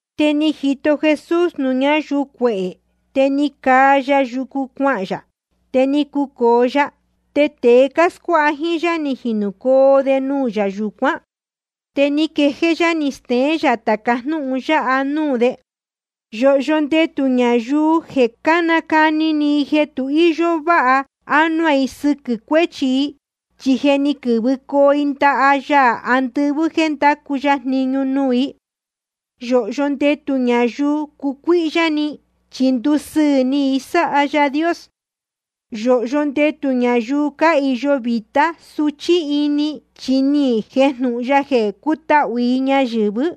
Te ni jito Jesús nuū ñáyuu cuehē. Te ni caa ya yucu cuahān yā, te ni cucōo ya. Te tēe cáscuáha jíín yá, ni jinūcoo de nuū yā yūcuán. Te ni quejéé yá ni steén yā tāca jnúhun yáha nuū de: Yōhyo ndetū ñayuu jeē cánacuni i jeē tu íyó váha ánuá i sɨquɨ̄ cuéchi i, chi je ni quɨ̄vɨcoo i ndaha Yaā andɨvɨ́ jéē ndácu ya jniñu nuū i. ’Yōhyo ndetū ñayuu cácucuíhyá ni, chi ndusɨɨ̄ ni i sáha Yaā Dios. ’Yōhyo ndetū ñayuu cáhīyo vītá suchí ini, chi ni jejnūhun ya jeē cutahū i ñayɨ̄vɨ́.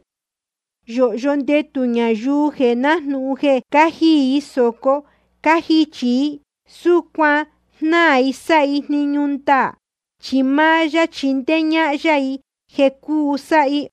’Yōhyo ndetū ñayuu jeē nájnūhun jeē cájiī i sōco cájichī i, súcuan jnáā i sáha i jniñu ndaā, chi máá yá chindéé ñáhán yá i jeē cuu sáha i.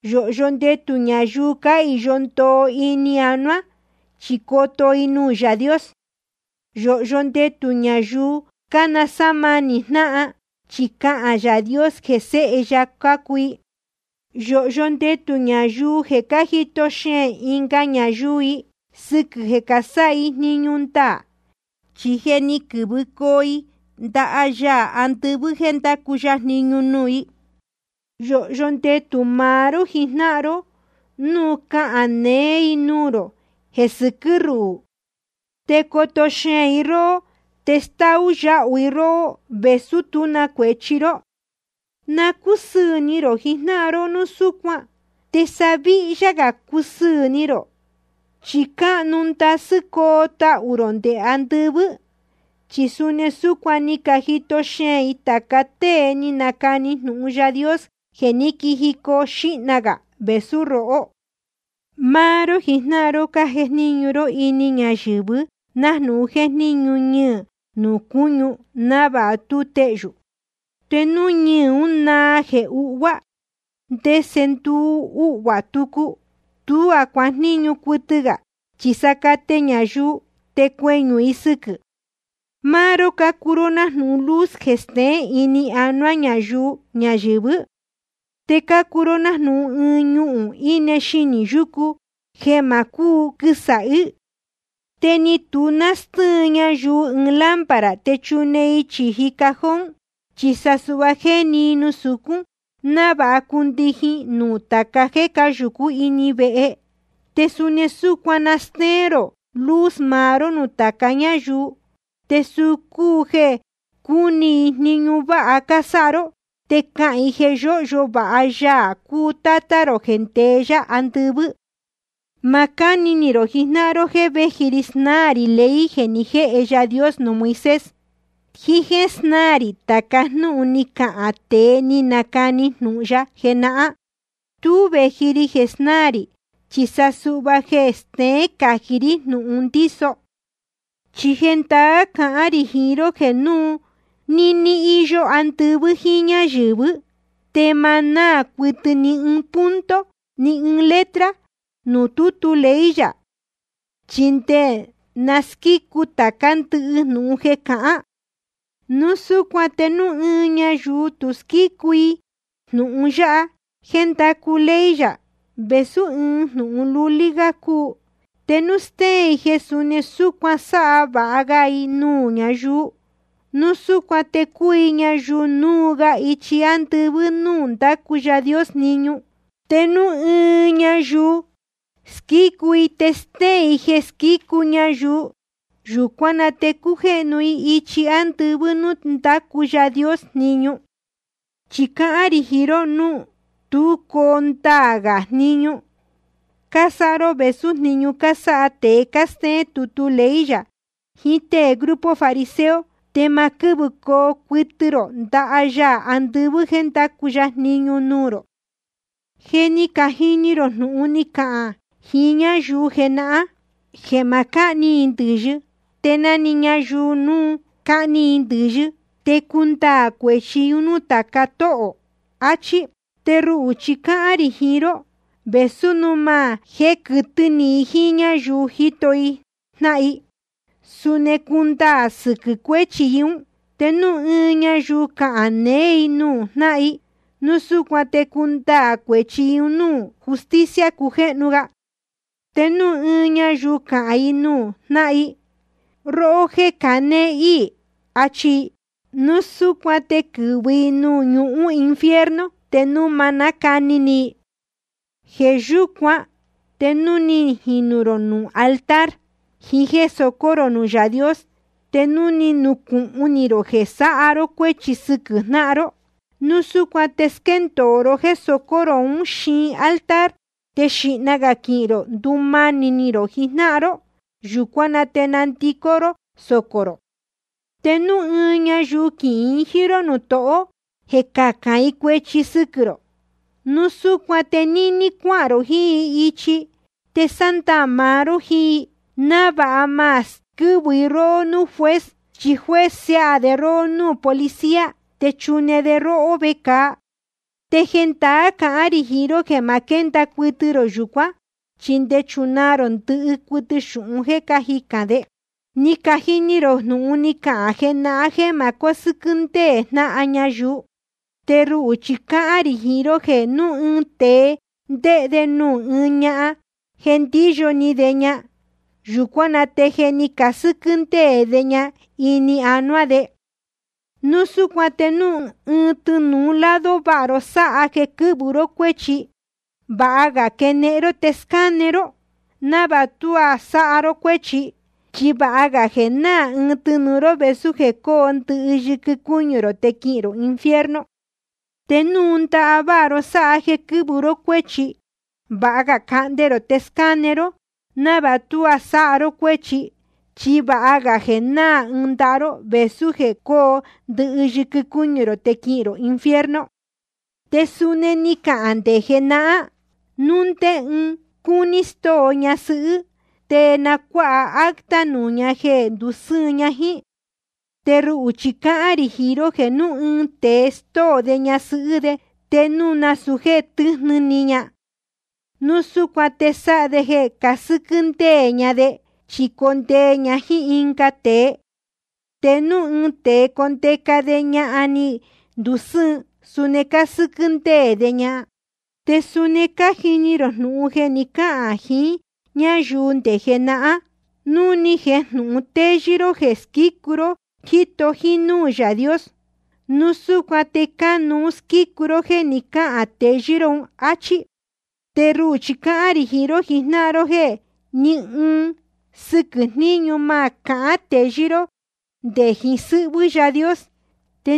’Yōhyo ndetū ñayuu cáhīyo ndoo ini anuá, chi coto i nuū Yaā Dios. ’Yōhyo ndetū ñayuu cánasámanī jnáhan, chi cahān Yaā Dios jeē sēhe ya cácuu i. ’Yōhyo ndetū ñayuu jeē cájito xeēn ɨnga ñayuu i sɨquɨ̄ jeē casáha i jniñu ndaā, chi je ni quɨ̄vɨcoo i ndaha Yaā andɨvɨ́ jéē ndácu ya jniñu nuū i. ’Yōhyo ndetū maá ró jijnáhan ró núu cácahān neé i nuū rō jeē sɨquɨ́ ruhū, te coto xeēn i róhó, te stáú yáhu i róhó, vēsú tú cuēchi ró. Na cúsɨɨ̄ ni rō jijnáhan ró núu súcuan, te sa víhyá gā cusɨɨ̄ ni rō, chi cáhnu ndasɨ́ coo tahū rō nde andɨvɨ́. Chi suni súcuan ni cajito xeēn i tāca tée ni canacani jnūhun Yaā Dios jeē ní quijicoo xīhna gā vēsú rohó. ’Máá ró jijnáhan ró cájejníñu ró ini ñayɨ̄vɨ nájnūhun jéjníñu ñɨɨ̄ nuū cúñu návāha tú tehyū. Te núu ñɨɨ̄ ún na náā jeē uhvuá, ¿te ndese nduu uhvuā tucu? Tuá cuajníñu cuɨtɨ gā, chi sa cate ñayuu te cueñū i sɨquɨ̄. ’Máá ró cácuu nájnūhun luz jeē steén ini anuá ñayuu ñayɨ̄vɨ́. Te cácuu ró nájnūhun ɨɨn ñuu íne xinī yúcu, jeē ma cúu quɨsāhí. Te ni tu nástɨ́ɨn ñayuu ɨɨn lámpara te chune i chīji cajón, chi sa suhva jéni i nuū sucún, návāha cundijin nuū tāca jéē cáyūcú ini vehe. Te suni súcuan na stéén rō luz maá ró nuū tāca ñáyuu, te suu cúu jeē cúni i jniñu váha cásáha ró, te cahān i jeē yóhyo vāha Yaā cúu Tátá rō jeē ndeé yá andɨvɨ́. ’Ma cáni ni rō jijnáhan ró jéē véji ri snáā rī ley jeē ni jéhe Yaā Dios nuū Moisés, jiín jéē snáā rī tāca jnúhun ni cacahān tēe ni canacani jnūhun ya jenahán. Tú vēji ri jeē snáā rī, chi sa suhva jeē steén cají rí jnūhun ndíso. Chi jendaá cahán rī jiín ró jeē núu níní íyó andɨvɨ́ jíín ñáyɨ̄vɨ́, te ma náā cuɨtɨ ni ɨɨn punto ni ɨɨn letra nuū tútu ley yā, chi nde na squícu tācá ndɨhɨ jnūhun jeē cahán. Núu súcuan te núu ɨɨn ñayuu tu squícu i ɨɨn jnūhun yáha jéē ndácu ley yā, vēsú ɨɨn jnūhun lulí gá cúu, te núu stéén i jeē suni súcuan sáha sava ga ñayuu, núu súcuan te cuu i ñayuu núu ga ichi andɨvɨ́ nuū ndácu Yaā Dios jniñu. Te núu ɨɨn ñayuu squícu i te stéén i jeē squícu ñayuu, yūcuán na te cujéhnu i ichi andɨvɨ́ nuū ndácu Yaā Dios jniñu. Chi cáhán rī jiín ró jeē núu tú coo ndaā gā jniñu cásáha ró vēsú jniñu cásáha tēe cástéén tutu ley yā jiín tée grupo fariseo, te ma quɨ́vɨcoo cuɨtɨ rō ndaha Yaā andɨvɨ́ jéē ndacu ya jniñu nuū rō. ’Je ni cajini ró jnúhun ni cacahān jiín ñáyuu jenahán, jeē ma cáhni i ndɨ̄yɨ, te na‑ni ñayuu núu cahni i ndɨ̄yɨ, te cundaā cuēchi i nuū tāca tóhō, achí. Te ruhū chi cáhán rī jiín ró, vēsú núu máá jéē quɨtɨ́ ni ɨɨn ñayuu jíto i jnáhan i, suni cundaā sɨquɨ̄ cuéchi i ún. Te núu ɨɨn ñayuu cahān neé i nuū jnáhan i, núu súcuan te cundaā cuēchi i un núū justicia cujéhnu ga. Te núu ɨɨn ñayuu cahān i nuū jnáhan i: Róhó jéē canéé íī, achi i, núu súcuan te quɨ̄vɨ i nuū ñuhún infierno te núu ma nácani ni i. ’Jeē yúcuan te núu ni jinū rō nuū altar jiín jéē socó rō nuū Yaā Dios, te núu ni nucūhun ni rō jeē ni sáha ró cuéchi sɨquɨ̄ jnáhan ró, núu súcuan te squéndōo ró jéē socó rō ún xiin altar, te xīhna gā quihīn rō ndumanī rō jiín jnáhan ró. Yūcuán na te nandicó ró socō rō. ’Te núu ɨɨn ñayuu quihīn i jíín ró nuū tohó jeē cacān i cuēchi sɨquɨ̄ rō, núu súcuan te níní cuáhān rō jiín i ichi te sándaā maá ró jíín i, návāha ma squɨ́vɨ i róhó núū juez. Chi juez siáha de róhó núū policía, te chune de róhó vecāa. Te jendaá cahán rī jiín ró jeē ma quénda cuɨtɨ rō yūcuán, chi nde chunaa rō ndɨhɨ cuɨtɨ xūhun jéē cájicān de. ’Ni cajini ró jnúhun ni cacahān jenahán jeē ma cósɨ́quɨ́ ndéē jnáhan ñayuu. Te ruhū chi cáhán rī jiín ró jeē núu ɨɨn tēe ndéhe de nuū ɨɨn ñahan jeē ndíyo ni de ña, yūcuán na te je ni casɨ́quɨ́ ndéē de ñahan ún ini anuá de. ’Núu súcuan te núu tɨnūu lado váha ró sáha jeē quɨ́vɨ ró cuéchi, vāha ga quenehen ró te scáne ró, návāha tuá sáha ró cuéchi. Chi vāha gā jeē náā ɨɨn tɨnūu ró vēsú jeē cóo ndɨhɨ yɨquɨ cúñu rō te quihīn rō infierno. Te núu ndaha váha ró sáha jeē quɨ́vɨ ró cuéchi, vāha ga cahnde rō te scáne ró, návāha tuá sáha ró cuéchi. Chi vāha ga jeē náā ɨɨn ndaha ró vēsú jeē cóo ndɨhɨ yɨquɨ cúñu rō te quihīn rō infierno. ’Te suni ni cacahān nde jenahán: Núu ndé ɨɨn cúní stóo ñasɨhɨ́, te na cuáha acta nuū ña jeē ndusɨ́ɨn jíín ña. Te ruhū chi sa cáhán rī jiín ró jeē núu ɨɨn tēe stóo de ñasɨhɨ́ de, te núu nasūu jéē tɨ́jnɨ ni ña, núu súcuan te sáha de jeē casɨ́quɨ́ ndéē ña de, chi condee ña jíín ɨnga tēe. Te núu ɨɨn tēe condeca de ñahan ní ndusɨ́ɨn, suni cásɨ́quɨ́ ndéē de ña. ’Te suni ni cajini ró jnúhun jeē ni cáhān jiín ñáyuu nde jenahán: Núu ni jejnūhun téyɨ́ ró jeē squícu ró, jíto jínúū Yaā Dios, núu súcuan te cánuú squícu ró jéē ni cáhān teyɨ́ ró un, áchí. Te ruhū chi cáhán rī jiín ró jijnáhan ró jeē ní ɨɨn sɨquɨ̄ jníñu ma cahán teyɨ́ ró nde jiín sɨ́hvɨ́ Yaā Dios,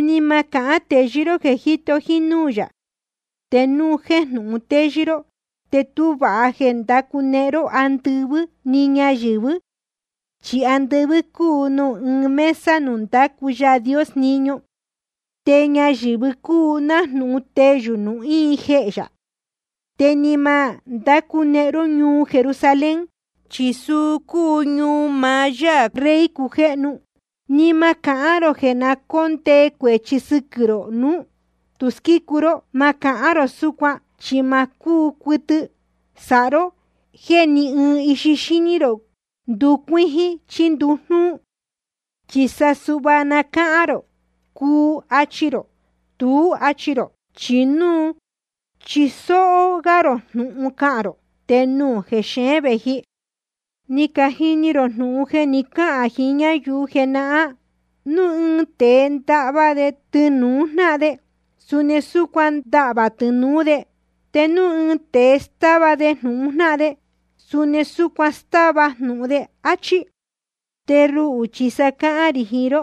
ni ma cahán teyɨ́ ró jeē jíto jínúū yā. Te núu jéjnūhun téyɨ́ ró te tú vāha jeē ndácunehen ró andɨvɨ́ ni ñayɨ̄vɨ́. Chi andɨvɨ́ cúu nuū íin mesa nuū ndácu Yaā Dios jniñu. Te ñayɨ̄vɨ cúu nájnūhun teyū nuū íin jehē yā. Te ni ma ndácunehen ró ñuu Jerusalén, chi suu cúu ñuu maá Yáā cúu Rey cujéhnu. Ni ma cahán rō jeē na cóndee cuēchi sɨquɨ̄ rō núu tu squícu ró. Ma cahán rō súcuan, chi ma cúu cuɨtɨ sáha ró jéē ni ɨɨn ixi xíní rō nducuíjín chí ndujnúú. Chi suhva‑ni cahān rō: Cuu, achi rō. Tuú, achi rō. Chi núu chisóó gá rō jnūhun cahān rō, te nuū jexeén vēji. ’Ni cajini ró jnúhun jeē ni cáhān jiín ñáyuu jenahán: Núu ɨɨn tēe ndahva de tɨnūu jnáhan de, suni súcuan na ndáhva tɨnūú de. Te núu ɨɨn tēe stáva de jnūhun jnáhan de, suni súcuan na stáva jnūhun de, áchí. Te ruhū chi sa cáhán rī jiín ró: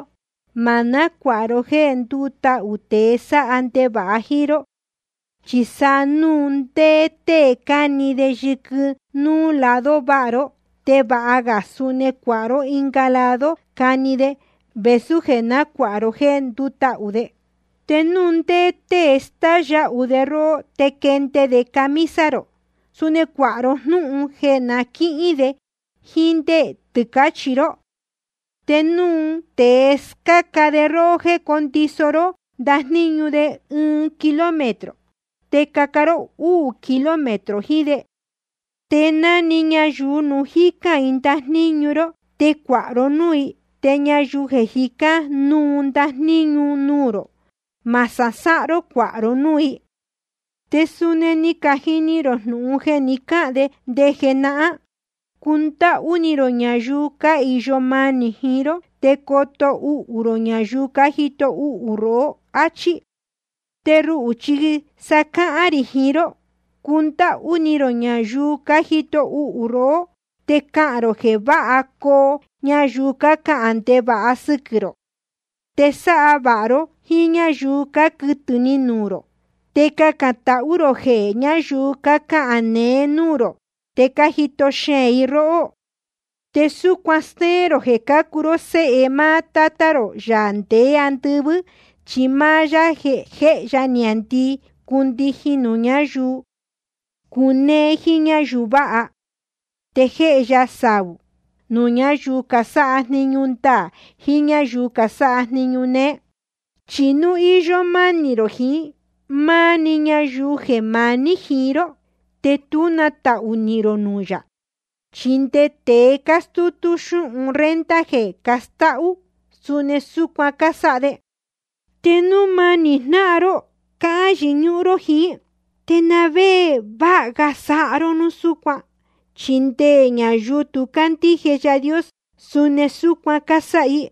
Ma nácuāha ró jéē ndútahū tēe sáha ndevāha jíín ró. Chi sa núu ndé tée cani de yɨquɨ núú lado váha ró, te vāha ga suni cuāha ró ɨnga lado cani de, vēsú jeē nácuāha ró jéē ndútahū de. Te núu ndé tée stáú yáhu de róhó te quénde de camisa rō, suni cuāha ró jnúhun jeē na quíhín de jíín ndé tɨcāchi ró. Te núu ndé tée scáca de róhó jéē condiso ró ndajníñu de ɨɨn kilómetro, te caca ró úū kilómetro jiín de. Te na‑ni ñayuu núu jícán i ndajníñu ró, te cuāha ró núū i. Te ñayuu jicán núu ndajníñu nuū rō, ma sasáhán ró cuāha ró núū i. ’Te suni ni cajini ró jnúhun jeē ni cáhān nde jenahán: Cundáhú ni rō ñayuu cáhīyo manī jiín ró, te coto uhū rō ñayuu cájito uhū rohó, áchí. Te ruhū chi sa cáhán rī jiín ró: Cundáhú ni rō ñayuu cájito uhū rohó. Te cacān rō jeē váha coo ñayuu cácahān ndevāha sɨquɨ̄ rō. Te sáha vāha ró jíín ñáyuu cáquɨtɨ̄ ni nuū rō. Te cacān tahú rō jehē ñáyuu cácahān neé núū rō te cájito xeēn i róhó. Te súcuan stéén rō jeē cácuu ró séhe máá Tátá rō, Yaā ndeé andɨvɨ́, chi máá yá jéhe niāndii cúndijin nuū ñáyuu cunéé jíín ñáyuu váha. Te jéhe ya saū nuū ñáyuu casáha jniñu ndaā jiín núū ñáyuu casáha jniñu néé. Chi núu íyó mánī rō jiín máá‑ni ñayuu jeē maní jiín ró, te tú na tahū nihīn rō nuū yā. Chi nde tēe cástútú xúhun renta jeē castáhú, suni súcuan cásáha de. Te núu máni jnáhan ró cáhán yɨñúhún ró jiín, ¿te na vé jeē váha ga sáha ró núu súcuan? Chi nde ñayuu tu cácandíje Yaā Dios, suni súcuan cásáha i.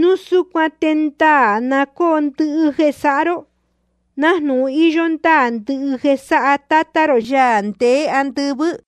Núu súcuan te ndaā na cóo ndɨhɨ jeē sáha ró, nájnūhun íyó ndáā ndɨhɨ jeē sáha Tátá rō, Yaā ndeé andɨvɨ́.